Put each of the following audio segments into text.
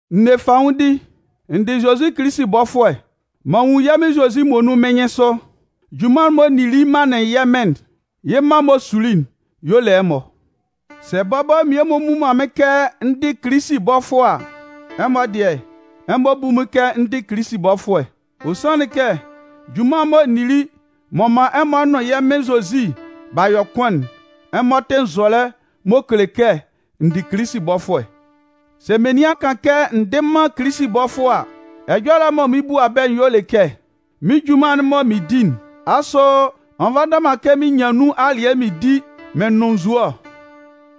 N ne fanwʋndi. N dɩ Zozi Kilisi bɔfʋɛ. M'an nwun yɛ́ Mɩn Zozi muonun mɩ́n nyɩnsʋ. Junman'n mɔ n nili manlɩn yɛ́ Mɩn'n, yɩ́ mma m'ɔ suli'n y'ɔ le ɛmɔ. Sɛ bɔbɔ mmie-mɔ mmu man mɩ́n kɛ n dɩ Kilisi bɔfʋɛ a, ɛmɔ dɩɛ, ɛmɔ bu mɩ́n kɛ n dɩ Kilisi bɔfʋɛ. Ɔ sanlɩn kɛ junman'n mɔ n nili m'ɔ man ɛmɔ nʋn yɛ́ Mɩn Zozi b'a yɔ kʋn'n, ɛmɔ tɩ nzɔlɛ m'ɔ kele kɛ n dɩ Kilisi bɔfʋɛ. Sɛ menian kan kɛ n dɩ man Kilisi bɔfʋɛ a, ɛjɔlɛ mɔ mɩn bua bɛ́'n y'ɔ le kɛ mɩ́n junman'n mɔ mɩn di'n, asʋ ɔ nvata man kɛ mɩn nyan nun alɩɛ mɩn di mɩn nʋn nzue ɔ?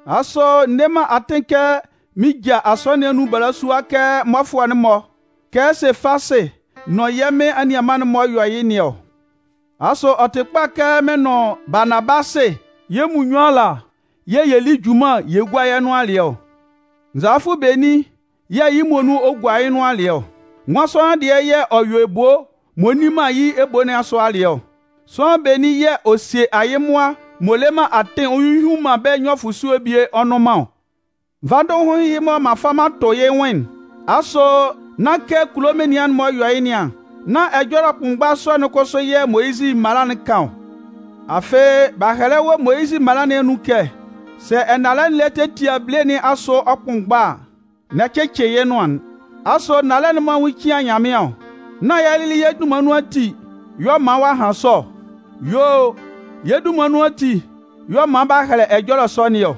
Asʋ n nne man atɩn kɛ mɩn ja asɔnɩn nɩn anun balasua kɛ mmɔfʋɛ'n-mɔ, kɛ Sefasɩ nʋn yɛ́ Mɩn anianman'n-mɔ yɔ yɩ́ nɩn ɔ? Asʋ ɔ tɩ kpa kɛ mɩn nʋn Baanabasɩ yɛ́ munnyuan ala yɛ̂ yɛ lí junman yɛ gúa yɛ́ nʋan alɩɛ ɔ? Nzalafʋ benin yɛ̂ yɩ́ muonun ɔ gua yɩ́ nʋan alɩɛ ɔ? Nwan sʋanlan dɩɛ yɛ̂ ɔ yɔ ebo m'ɔ nni man yɩ́ ebo nɩn asʋ alɩɛ ɔ? Sʋanlan benin yɛ̂ ɔ sie ayɛmʋa m'ɔ le man atɩn ɔ nyuihyuin man bɛ́ nyafʋsue'n bie a nnʋn man ɔ? Nvandʋhʋn ɛhɩ-mɔ mɔ m'an fa m'an tʋ yɩ́ nwʋn'n, asʋ nán kɛ kulo menian'n-mɔ yɔ yɩ́ nɩn an? Nán ɛjɔlɛ kʋnmgba sɔ'n kʋsʋ yɛ̂ Moyizɩ mala'n kan ɔ? Afɩ b'a hɛlɛ wɔ Moyizɩ mala nɩn anun kɛ: Sɛ ɛnalɛ'n lɛ tetia bele nɩn asʋ ɔ kpʋnmgba a, n'ɛ cɩcɩ yɩ́ nʋan'n. Asʋ nnalɛ'n-mɔ anwʋn cian Nyanmɩan ɔ? Nán yɛ́ lɩlɩ yɛ́ dunman nun ati yɛ̂ ɔ man ɔ'a han sɔ ɔ? Yuo, yɛ́ dunman nun ati yɛ̂ ɔ man b'a hɛlɛ ɛjɔlɛ sɔ nɩn ɔ.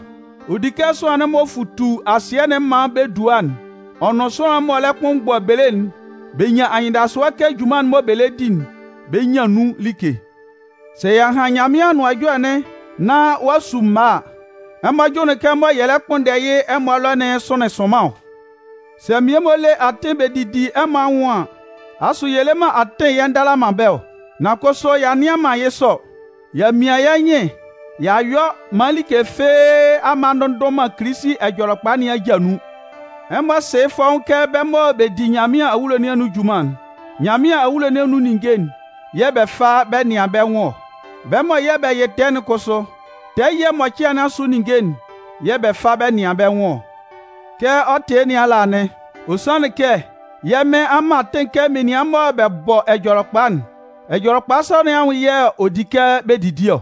Ɔ di kɛ sʋanlan'n m'ɔ lɛ futu asɩɛ'n maan bɛ dua'n, ɔ nʋn sʋanlan'n m'ɔ lɛ kpʋnmgbɔ bele'n, bɛ nyan anyɩndasʋɛ kɛ junman'n mɔ bɛ lɛ di'n, bɛ 'nyan nun like. Sɛ y'a han Nyanmɩan Anʋan Ɛjɔlɛ'n nán ɔ su mma a, ɛmɔ jʋnlɩn kɛ mɔ yɛ lɛ kpʋnndɛ yɩ́ ɛmɔ ɛlɔ'n sʋnlɩn sʋnman ɔ? Sɛ mmie-mɔ le atɩn bɛ didi ɛmɔ anwʋn an, asʋ yɛ le man atɩn yɛ ndala man bɛ́ ɔ? Nan kʋsʋ y'a nnɩan man yɩ́ sɔ. Y'a mian yɛ́ nyɩn y'a yɔ maan like fɩ́ɩ́ a mma a ndʋnndʋn man Kilisi Ɛjɔlɛkpa nɩn aja nun. Ɛmɔ sɩ yɩ́ fɔ́ʋ́n kɛ bɛ́ mɔ bɛ di Nyanmɩan awulo nɩn anun junman'n, Nyanmɩan awulo nɩn anun ninnge'n yɛ̂ bɛ fa bɛ nɩan bɛ́ nwʋn ɔ. Bɛ́ mɔ yɛ̂ bɛ yɩ tɛɛ'n kʋsʋ, tɛɛ ɛyɩɛ mʋcɩa nɩn asʋ ninnge'n yɛ̂ bɛ fa bɛ nɩan bɛ́ nwʋn ɔ. Kɛ ɔ tɩ yɩ́ nɩn ala anɩn. Ɔ sanlɩn kɛ yɛ́ Mɩn a man atɩn kɛ menian mɔ bɛ bɔ Ɛjɔlɛkpa'n, Ɛjɔlɛkpa sɔ nɩn anwʋn yɛ̂ ɔ di kɛ bɛ didi ɔ.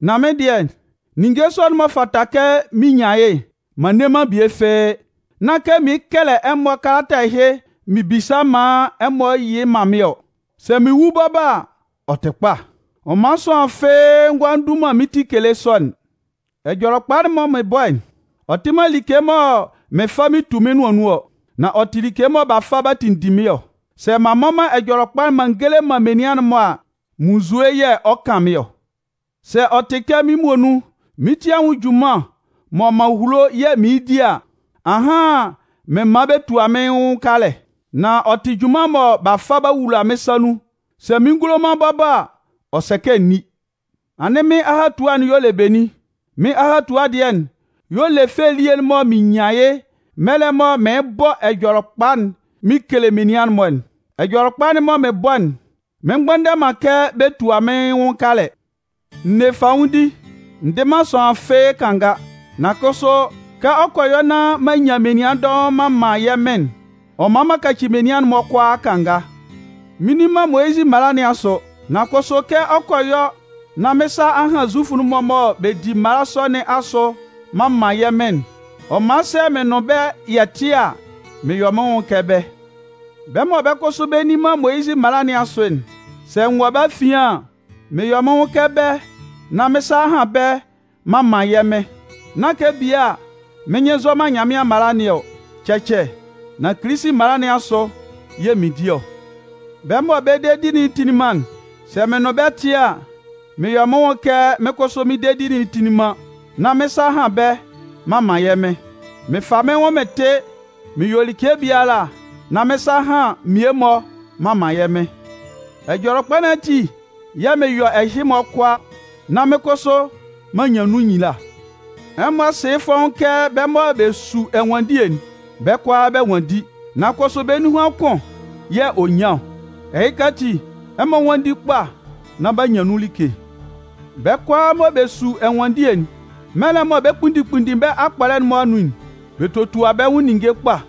Nan mɩ́n dɩɛ, ninnge sɔ'n m'ɔ fata kɛ mɩn nyan yɩ́'n, m'an nne man bie fɩ́ɩ́. Nán kɛ mɩɩn kɛlɛ ɛmɔ kalata ɛhɩ mɩn bisa maan ɛmɔ yɩ man mɩ́n ɔ. Sɛ mɩn 'wu bɔbɔ a, ɔ tɩ kpa. Ɔ man sʋanlɩn fɩ́ɩ́ ngʋala ndu man mɩ́n ti kele sɔ'n. Ɛjɔlɛkpa'n mɔ mɩn bɔ'n, ɔ tɩ man like mɔ mɩn fa mɩn tu mɩ́n nʋan nun ɔ. Nan ɔ tɩ like mɔ b'a fa b'a tinndin mɩ́n ɔ. Sɛ m'an mmɔ Ɛjɔlɛkpa'n m'an ngele man menian'n-mɔ a, munnzue yɛ ɔ 'kan mɩ́n ɔ. Sɛ ɔ tɩ kɛ mɩ́n muonun mɩ́n ti anwʋn junman mɔ m'an hulo yɛ̂ mɩɩn di a, ahan mɩn man bɛ tua mɩ́n yɩ́ nwʋn kalɛ. Nan ɔ tɩ junman mɔ b'a fa b'a wula mɩ́n sa nun, sɛ mɩn ngulo man bɔbɔ a, ɔ sɛ kɛ n ní. Anɩn mɩ́n ahatua'n y'ɔ le benin? Mɩ́n ahatua'n dɩɛ'n y'ɔ le fɛ elie'n mɔ mɩn nyan yɩ́ mɛlɛ mɔ mɩɩn bɔ Ɛjɔlɛkpa'n mɩn kele menian'n-mɔ'n. Ɛjɔlɛkpa'n mɔ mɩn bɔ'n, mɩn mgbʋnndɛ man kɛ bɛ tua mɩ́n yɩ́ nwʋn kalɛ. N ne fanwʋndi, n ndɩ sʋanlan fɩ́ɩ́ kanga. Nan kʋsʋ kɛ ɔ kɔ yɔ nán m'an nyan menian dɔʋn m'an man yɛ́ Mɩn'n, ɔ man m'an kaci menian'n-mɔ kʋalaa kanga. Mɩn nni man Moyizɩ mala nɩn asʋ, nan kʋsʋ kɛ ɔ kɔ yɔ nán mɩ́n sa a han Zufʋ'n-mɔ mɔ bɛ di mala sɔ nɩn asʋ m'an man yɛ́ Mɩn'n, ɔ man sɛ mɩn nʋn bɛ́ yɛ̂ tɩ a, mɩn yɔ mɩ́n nwʋn kɛ bɛ́. Bɛ́ mɔ bɛ́ kʋsʋ bɛ nni man Moyizɩ mala nɩn asʋ'n, sɛ n wɔ bɛ́ afian an, mɩn yɔ mɩ́n nwʋn kɛ bɛ́ nán mɩ́n sa a han bɛ́, m'an man yɛ́ Mɩn. Nán kɛ bie a mɩ́n nyɩn nzɔ man Nyanmɩan mala nɩn ɔ. Cɛcɛ, nan Kilisi mala nɩn asʋ yɛ́ mɩn di ɔ. Bɛ́ mɔ bɛ́ dedi'n tinlin man'n, sɛ mɩn nʋn bɛ́ tɩ a, mɩn yɔ mɩ́n nwʋn kɛ mɩ́n kʋsʋ mɩ́n dedi'n tinlin man nán mɩ́n sa a han bɛ́, m'an man yɛ́ Mɩn. Mɩn fa mɩ́n nwʋn mɩn tɩ mɩn yɔ like biala nán mɩ́n sa a han mmie-mɔ m'an man yɛ́ Mɩn. Ɛjɔlɛkpa nɩn ati yɛ̂ mɩn yɔ ɛhɩ-mɔ kʋalaa nán mɩ́n kʋsʋ m'an nyan nun nyila. Ɛmɔ sɩ yɩ́ fɔ́ʋ́n kɛ bɛ́ mɔ bɛ su ɛnwanndie'n, bɛ́ kʋalaa bɛ nwanndi, nan kʋsʋ bɛ́ nunhan kʋn yɛ̂ ɔ nyan ɔ. Ɛhɩka ati, ɛmɔ nwánndi kpa, nán b'a nyan nun like. Bɛ́ kʋalaa mɔ bɛ su ɛnwanndie'n, mɛlɛ mɔ bɛ 'kpunndin kpunndin bɛ́ akpɔlɛ'n-mɔ anun'n, bɛ totua bɛ́ nwʋn ninnge kpa.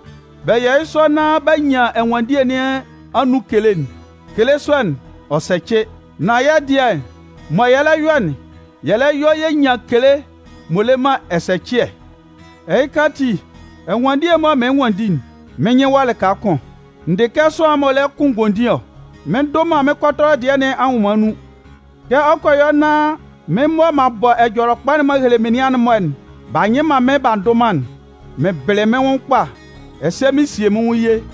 Bɛ yɔ yɩ́ sɔ nán b'a nyan ɛnwanndie nɩn anun kele'n. Kele sɔ'n, ɔ sɛcɩ. Nan yɛ́ dɩɛ mɔ yɛ lɛ yɔ'n, yɛ lɛ yɔ yɛ nyan kele m'ɔ le man ɛsɛcɩɛ'n. Ɛhɩka ati, ɛnwanndie'n mɔ mɩɩn nwanndi'n, mɩ́n nyɩn wɔ lɩka kʋn. N dɩ kɛ sʋanlan m'ɔ lɛ kʋn ngondin ɔ. Mɩn ndʋ man mɩ́n kɔtɔlɛ dɩɛ nɩn anwʋnman nun. Kɛ ɔ kɔ yɔ nán mɩ́n mɔ m'an bɔ Ɛjɔlɛkpa'n m'an hele menian'n-mɔ'n b'a nyɩ man mɩ́n b'a ndʋ man'n, mɩn bɩlɩ mɩ́n nwʋn kpa, ɛsɛ mɩn sie mɩ́n nwʋn ye.